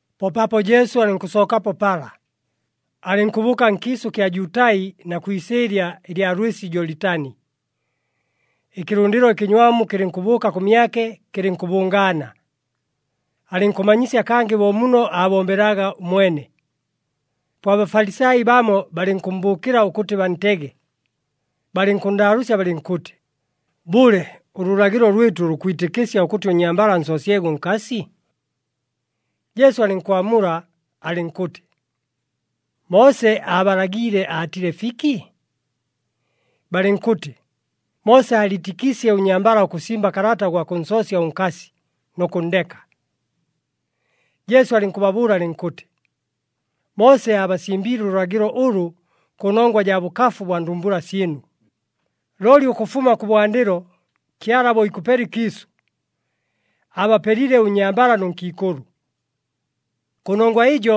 Po paapo Jesu alɨnkʉsookapo pala, alɨnkʉbʉʉka nkiisʉ kya Jutai na kwi isɨɨlya ɨlya lwɨsi Jolitani. Ɨkɨlʉndɨlo ɨkɨnywamu kɨlɨnkʉbʉʉka kʉmyake kɨlɨnkʉbʉngaana. Alɨnkʉmanyisya kangɨ bo muno aabombelaga ʉmwene. Po aBafalisai bamo balɨnkʉmmbʉʉkɨla ʉkʉtɨ bantege, balɨnkʉnndaalʉʉsya balɨnkʉtɨ, “Bʉle, ʉlʉlagɨlo lwɨtʉ lukwitɨkɨsya ʉkʉtɨ ʉnnyambala ansoosyege ʉnkasi?” Jesu alɨnkwamula alɨnkʉtɨ, “Moose aabalagiile aatile fiki?” Balɨnkʉtɨ, “Moose aaliitɨkiisye ʉnnyambala ʉkʉsimba kalata ʉgwa kʉnsoosya ʉnkasi, nʉ kʉnndeka.” Jesu alɨnkʉbabʉʉla alɨnkʉtɨ, “Moose aabasimbiile ʉlʉlagɨlo ʉlʉ kʉnongwa jaa bʉkafu bwa ndumbula syɨnu. Looli ʉkʉfuma kʉbwandɨlo, Kyala bo ikʉpela ɨkiisʉ, ‘Aabapelile ʉnnyambala nʉ nkiikʉlʉ.’ ‘Kʉnongwa ɨjo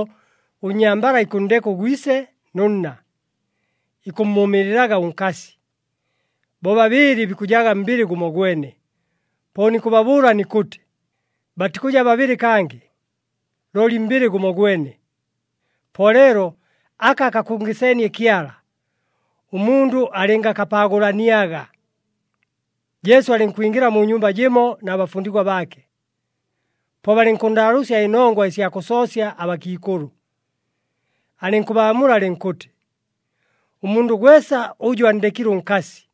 ʉnnyambala ikʉnndeka ʉgwise nʉ nna, ikʉmmʉʉmɨɨlɨlaga ʉnkasi, bobabɨɨlɨ bikʉjaga mbɨlɨ gʉmogwene.’ Po nikʉbabʉʉla nikʉtɨ, batikʉja babɨlɨ kangɨ, looli mbɨlɨ gʉmogwene. Po leelo aka akakʉngɨseenie Kyala, ʉmundʉ alɨngakapaagʉlaniaga.” Jesu alɨnkwingɨla mu nyumba jɨmo na bafundigwa baake. Po balɨnkʉnndaalʉʉsya ɨnongwa ɨsya kʉsoosya abakiikʉlʉ. Alɨnkʉbaamula alɨnkʉtɨ, “Ʉmundʉ gwesa ʉjʉ anndekile ʉnkasi,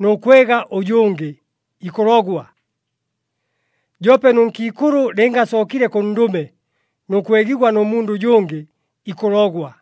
nʉ kwega ʉjʉngɨ, ikʉlogwa. Joope nʉ nkiikʉlʉ lɨnga asookile kʉ ndʉme nʉ kwegigwa nʉ mundʉ ʉjʉngɨ, ikʉlogwa.”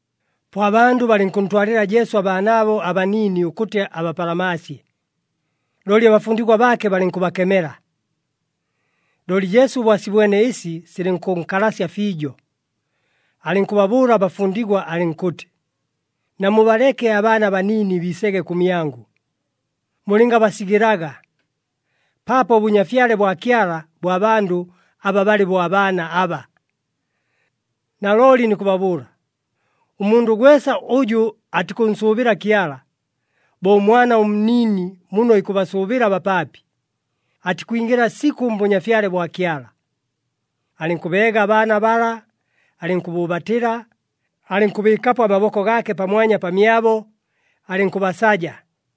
Po abandʉ balɨnkʉntwalɨla Jesu abaanaabo abaniini ʉkʉtɨ abapalamaasye, looli abafundigwa baake balɨnkʉbakemela. Looli Jesu bo asibwene ɨsi silɨnkʉnkalasya fiijo, alɨnkʉbabʉʉla abafundigwa alɨnkʉtɨ, “Namubaleke abaana abaniini biisege kʉmyangʉ, mulɨngabasigɨlaga, paapo ʉBʉnyafyale bwa Kyala bwa bandʉ aba balɨ bo abaana aba. Nalooli nikʉbabʉʉla, ʉmundʉ gwesa ʉjʉ atikʉnsʉʉbɨla Kyala, bo ʉmwana ʉnniini muno ikʉbasʉʉbɨla abapaapi, atikwingɨla sikʉ mBʉnyafyale bwa Kyala.” Alɨnkʉbeega abaana bala, alɨnkʉbʉʉbatɨla, alɨnkʉbɨɨkapo amaboko gaake pamwanya pamyabo, alɨnkʉbasaja.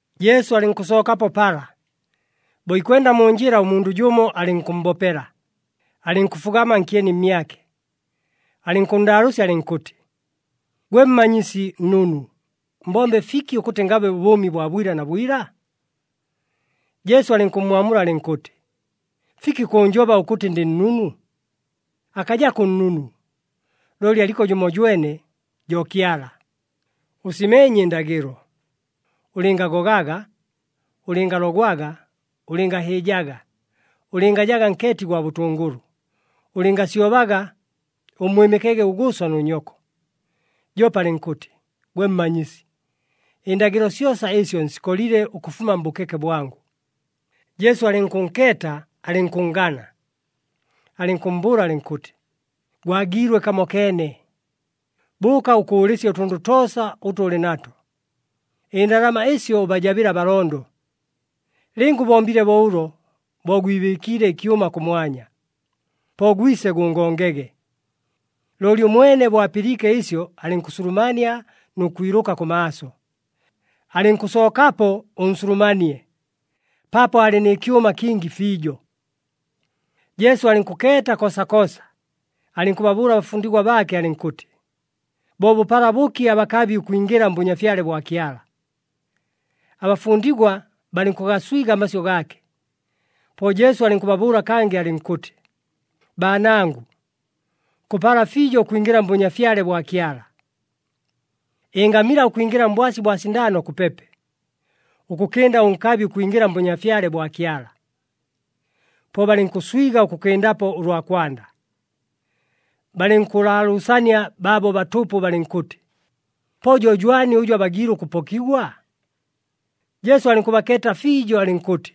Jesu alɨnkʉsookapo pala. Bo ikwenda mu njɨla, ʉmundʉ jʉmo alɨnkʉmmbopela, alɨnkʉfugama nkyeni mmyake. Alɨnkʉnndaalʉʉsya alɨnkʉtɨ, “Gwe Mmanyisi Nnunu, mbombe ɨfiki ʉkʉtɨ ngabe ʉbʉʉmi bwa bwila na bwila?” Jesu alɨnkʉmmwamula alɨnkʉtɨ, “Fiki kʉʉnjoba ʉkʉtɨ ndɨ nnunu? Akajako ʉnnunu, looli aliko jʉmojwene, jo Kyala! Ʉsimeenye ɨndagɨlo, ‘Ʉlɨngagogaga, ʉlɨngalogwaga, ʉlɨngahɨɨjaga, ʉlɨngajaga nkeeti gwa bʉtʉngʉlʉ, ʉlɨngasyobaga, ʉmmwɨmɨkege ʉgʉʉso nʉ nyoko.’” Joope alɨnkʉtɨ, “Gwe Mmanyisi, ɨndagɨlo syosa ɨsyo nsikolile ʉkʉfuma mbʉkeke bwangʉ.” Jesu alɨnkʉnkeeta alɨnkʉnngana, alɨnkʉmmbʉʉla alɨnkʉtɨ, “Gwagiilwe kamokeene. Bʉʉka ʉkʉʉlɨsye ʉtʉndʉ toosa ʉtʉ ʉlɨ nato, ɨndalama ɨsyo ʉbajabɨle abalondo. Lɨnga ʉbombile bo ʉlo, bo gwibɨɨkiile ɨkyʉma kʉmwanya. Po gwise gʉngongege.” Looli ʉmwene bo apɨliike ɨsyo alɨnkʉsulumania nʉ kwilʉka kʉmaaso. Alɨnkʉsookapo ʉnsulumanie, paapo aalɨ nɨ kyʉma kingi fiijo. Jesu alɨnkʉkeeta koosakoosa, alɨnkʉbabʉʉla abafundigwa baake alɨnkʉtɨ, “Bo bʉpala bʉki abakabi ʉkwingɨla mBʉnyafyale bwa Kyala!” Abafundigwa balɨnkʉgaswiga amasyʉ gaake. Po Jesu alɨnkʉbabʉʉla kangɨ alɨnkʉtɨ, “Baanangʉ, kʉpala fiijo ʉkwingɨla mBʉnyafyale bwa Kyala! Ɨngamila ʉkwingɨla mbwasi bwa sindaano kʉpepe, ʉkʉkɨnda ʉnkabi ʉkwingɨla mBʉnyafyale bwa Kyala!” Po balɨnkʉswiga ʉkʉkɨndapo ʉlwa kwanda, balɨnkʉlaalʉʉsania baabo batʉpʉ, balɨnkʉtɨ, “Po jo jwani ʉjʉ abagiile ʉkʉpokigwa?” Jesu alɨnkʉbakeeta fiijo, alɨnkʉtɨ,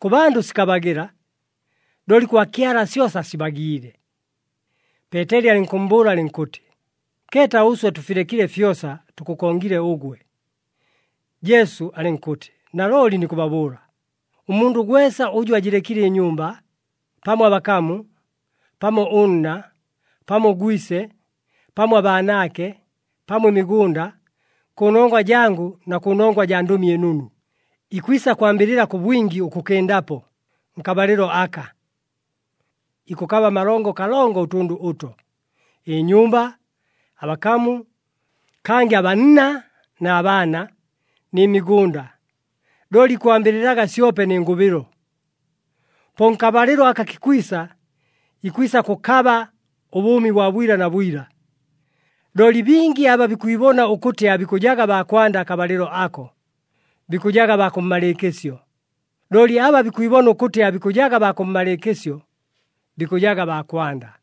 “Kʉ bandʉ sikabagɨla, looli kwa Kyala syosa sibagiile.” Peeteli alɨnkʉmmbʉʉla alɨnkʉtɨ, “Keeta, ʉswe tʉfilekile fyosa, tʉkʉkongile ʉgwe!” Jesu alɨnkʉtɨ, “Nalooli nikʉbabʉʉla, ʉmundʉ gwesa ʉjʉ ajɨlekile ɨnyumba, pamo abakamu, pamo ʉnna, pamo ʉgwise, pamo abaanaake, pamo ɨmigʉnda, kʉnongwa jangʉ na kʉnongwa jaa Ndʉmi ɨNunu, ikwisa kwambɨlɨla kʉ bwingi ʉkʉkɨndapo, nkabalɨlo aka. Ikʉkaba amalongo kalongo ʉtʉndʉ ʉto, ɨnyumba, abakamu, kangɨ abanna na baana, nɨ migʉnda. Looli ikwambɨlɨlaga syope nɨ ngʉbɨlo. Po nkabalɨlo aka kikwisa, ikwisa kʉkaba ʉbʉʉmi bwa bwila na bwila. Looli bingi aba bikwibona ʉkʉtɨ aabikʉjaga baa kwanda akabalɨlo ako, bikʉjaga baa kʉmmalɨɨkɨsyo. Looli aba bikwibona ʉkʉtɨ aabikʉjaga baa kʉmmalɨɨkɨsyo, bikʉjaga baa kwanda.”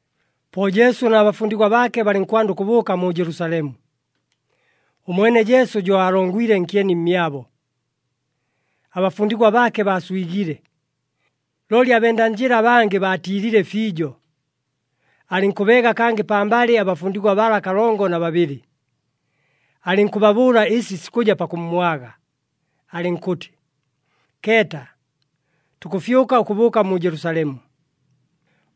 Po Jesu na bafundigwa baake balɨnkwanda ʉkʉbʉʉka mu Jelusalemu. Ʉmwene Jesu jo aalongwile nkyeni mmyabo. Abafundigwa baake baaswigile, looli abenda njɨla abangɨ baatiilile fiijo. Alɨnkʉbeega kangɨ pambalɨ abafundigwa bala kalongo na babɨlɨ, alɨnkʉbabʉʉla ɨsi sikʉja pakʉmmwaga, alɨnkʉtɨ, “Keeta, tukʉfyʉka ʉkʉbʉʉka mu Jelusalemu.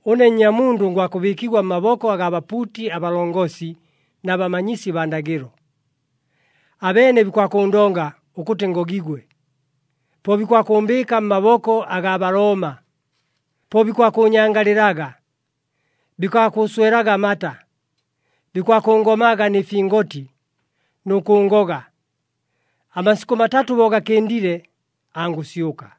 Ʉne Nnyamundʉ ngwakʉbɨɨkigwa mmaboko agaa bapuuti abalongosi na bamanyisi baa ndagɨlo. Abeene bikwakʉʉndonga ʉkʉtɨ ngogigwe. Po bikwakʉʉmbɨɨka mmaboko agaa Balooma. Po bikwakʉʉnyangalɨlaga, bikwakʉʉswelaga amata, bikwakʉngomaga nɨ fingoti, nʉ kʉʉngoga. Amasikʉ matatʉ bo gakɨndile, angʉsyʉka.”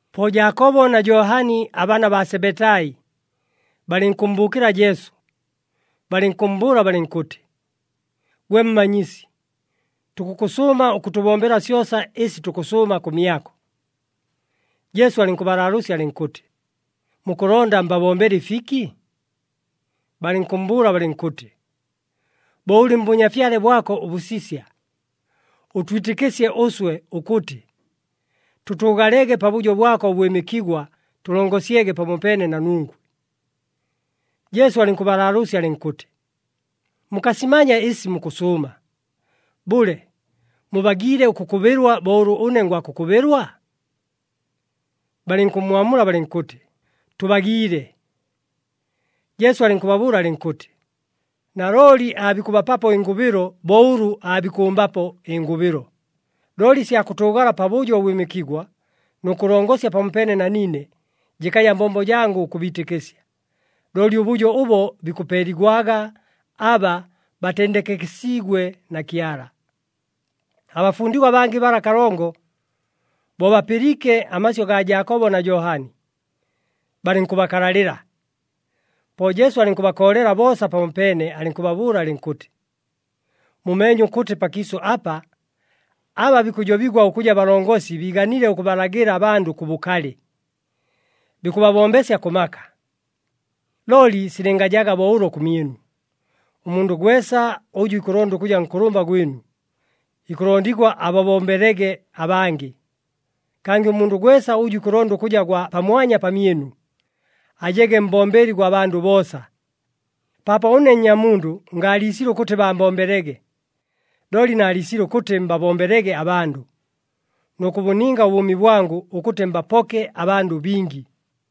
Po Jaakobo na Johani abaana baa Sebetai, balɨnkʉmmbʉʉkɨla Jesu, balɨnkʉmmbʉʉla balɨnkʉtɨ, “Gwe Mmanyisi, tukʉkʉsʉʉma ʉkʉtʉbombela syosa ɨsi tukʉsʉʉma kʉmyako.” Jesu alɨnkʉbalaalʉʉsya alɨnkʉtɨ, “Mukʉlonda mbabombele ɨfiki?” Balɨnkʉmmbʉʉla balɨnkʉtɨ, “Bo ʉlɨ mBʉnyafyale bwako ʉbʉsisya, ʉtwitɨkɨsye ʉswe ʉkʉtɨ, tʉtʉʉgalege pabʉjo bwako ʉbwɨmɨkigwa tʉlongosyege pamopeene na nungwe.” Jesu alɨnkʉbalaalʉʉsya alɨnkʉtɨ, “Mukasimanya ɨsi mukʉsʉʉma. Bʉle, mubagiile ʉkʉkʉbɨlwa bo ʉlʉ ʉne ngwakʉkʉbɨlwa?” Balɨnkʉmmwamula balɨnkʉtɨ, “Tʉbagiile.” Jesu alɨnkʉbabʉʉla alɨnkʉtɨ, “Nalooli aabikʉbapapo ɨngʉbɨlo bo ʉlʉ aabikʉmbapo ɨngʉbɨlo. Looli ɨsya kʉtʉʉgala pabʉjo ʉbwɨmɨkigwa nʉ kʉlongosya pamopeene na niine jɨkaja mbombo jangʉ ʉkʉbiitɨkɨsya, looli ʉbʉjo ʉbo bikʉpeeligwaga aba batendekekesiigwe na Kyala.” Abafundigwa abangɨ bala kalongo, bo bapɨliike amasyʉ gaa Jaakobo na Johani, balɨnkʉbakalalɨla. Po Jesu alɨnkʉbakoolela boosa pamopeene alɨnkʉbabʉʉla alɨnkʉtɨ, “Mumeenye ʉkʉtɨ pakiisʉ apa, aba bikʉjobigwa ʉkʉja balongosi biiganile ʉkʉbalagɨla abandʉ kʉ bʉkalɨ, bikʉbabombesya kʉ maka. Looli silɨngajaga bo ʉlo kʉmyɨnu. Ʉmundʉ gwesa ʉjʉ ikʉlonda ʉkʉja nkʉlʉmba gwɨnu, ikʉlondigwa ababombelege abangɨ. Kangɨ ʉmundʉ gwesa ʉjʉ ikʉlonda ʉkʉja gwa pamwanya pamyɨnu, ajege mbombeli gwa bandʉ boosa. Paapo ʉne Nnyamundʉ ngaaliisile ʉkʉtɨ baambombelege, looli naaliisile ʉkʉtɨ mbabombelege abandʉ, nʉ kʉbʉninga ʉbʉʉmi bwangʉ ʉkʉtɨ mbapoke abandʉ bingi.”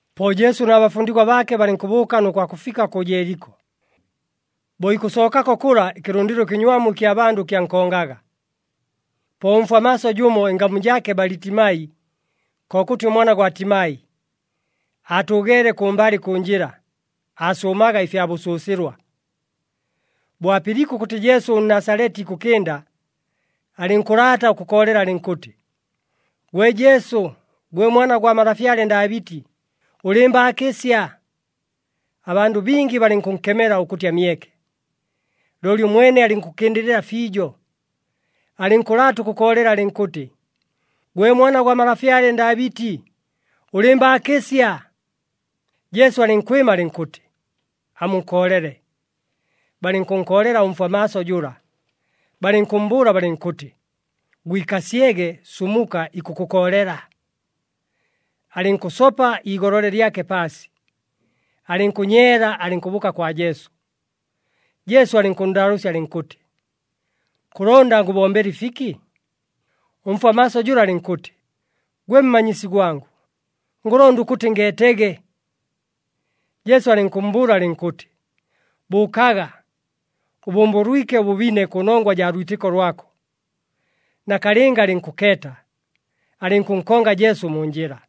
Po Jesu na bafundigwa baake balɨnkʉbʉʉka nʉ kwakʉfika kʉ Jeeliko. Bo ikʉsookako kʉla, ɨkɨlʉndɨlo ɨkɨnywamu ɨkya bandʉ kyankongaga. Po ʉmfwa maaso jʉmo, ɨngamu jaake Balitimai, kokʉtɨ ʉmwana gwa Timai, aatʉʉgeele kʉmbalɨ kʉ njɨla, aasʉʉmaga ɨfya bʉsʉsɨlwa. Bo apɨliike ʉkʉtɨ Jesu ʉNnasaleti ikʉkɨnda, alɨnkʉlaata ʉkʉkoolela alɨnkʉtɨ, “Gwe Jesu, gwe Mwana gwa malafyale Ndaabɨti, ʉlɨɨmbaakɨsya!” Abandʉ bingi balɨnkʉnkemela ʉkʉtɨ amyeke. Looli ʉmwene alɨnkʉkɨndɨlɨla fiijo, alɨnkʉlaata ʉkʉkoolela alɨnkʉtɨ, “Gwe Mwana gwa malafyale Ndaabɨti, ʉlɨɨmbaakɨsya!” Jesu alɨnkwɨma alɨnkʉtɨ, “Amunkoolele.” Balɨnkʉnkoolela ʉmfwa maaso jʉla, balɨnkʉmmbʉʉla balɨnkʉtɨ, “Gwikasyege, sumuka, ikʉkʉkoolela!” Alɨnkʉsopa iigolole lyake paasi, alɨnkʉnyeela alɨnkʉbʉʉka kwa Jesu. Jesu alɨnkʉnndaalʉʉsya alɨnkʉtɨ, “Kʉlonda ngʉbombele ɨfiki?” Ʉmfwa maaso jʉla alɨnkʉtɨ, “Gwe Mmanyisi gwangʉ, ngʉlonda ʉkʉtɨ ngeetege.” Jesu alɨnkʉmmbʉʉla alɨnkʉtɨ, “Bʉʉkaga! Ʉbʉmbʉlwike ʉbʉbine kʉnongwa jaa lwitɨko lwako.” Nakalɨnga alɨnkʉkeeta, alɨnkʉnkonga Jesu mu njɨla.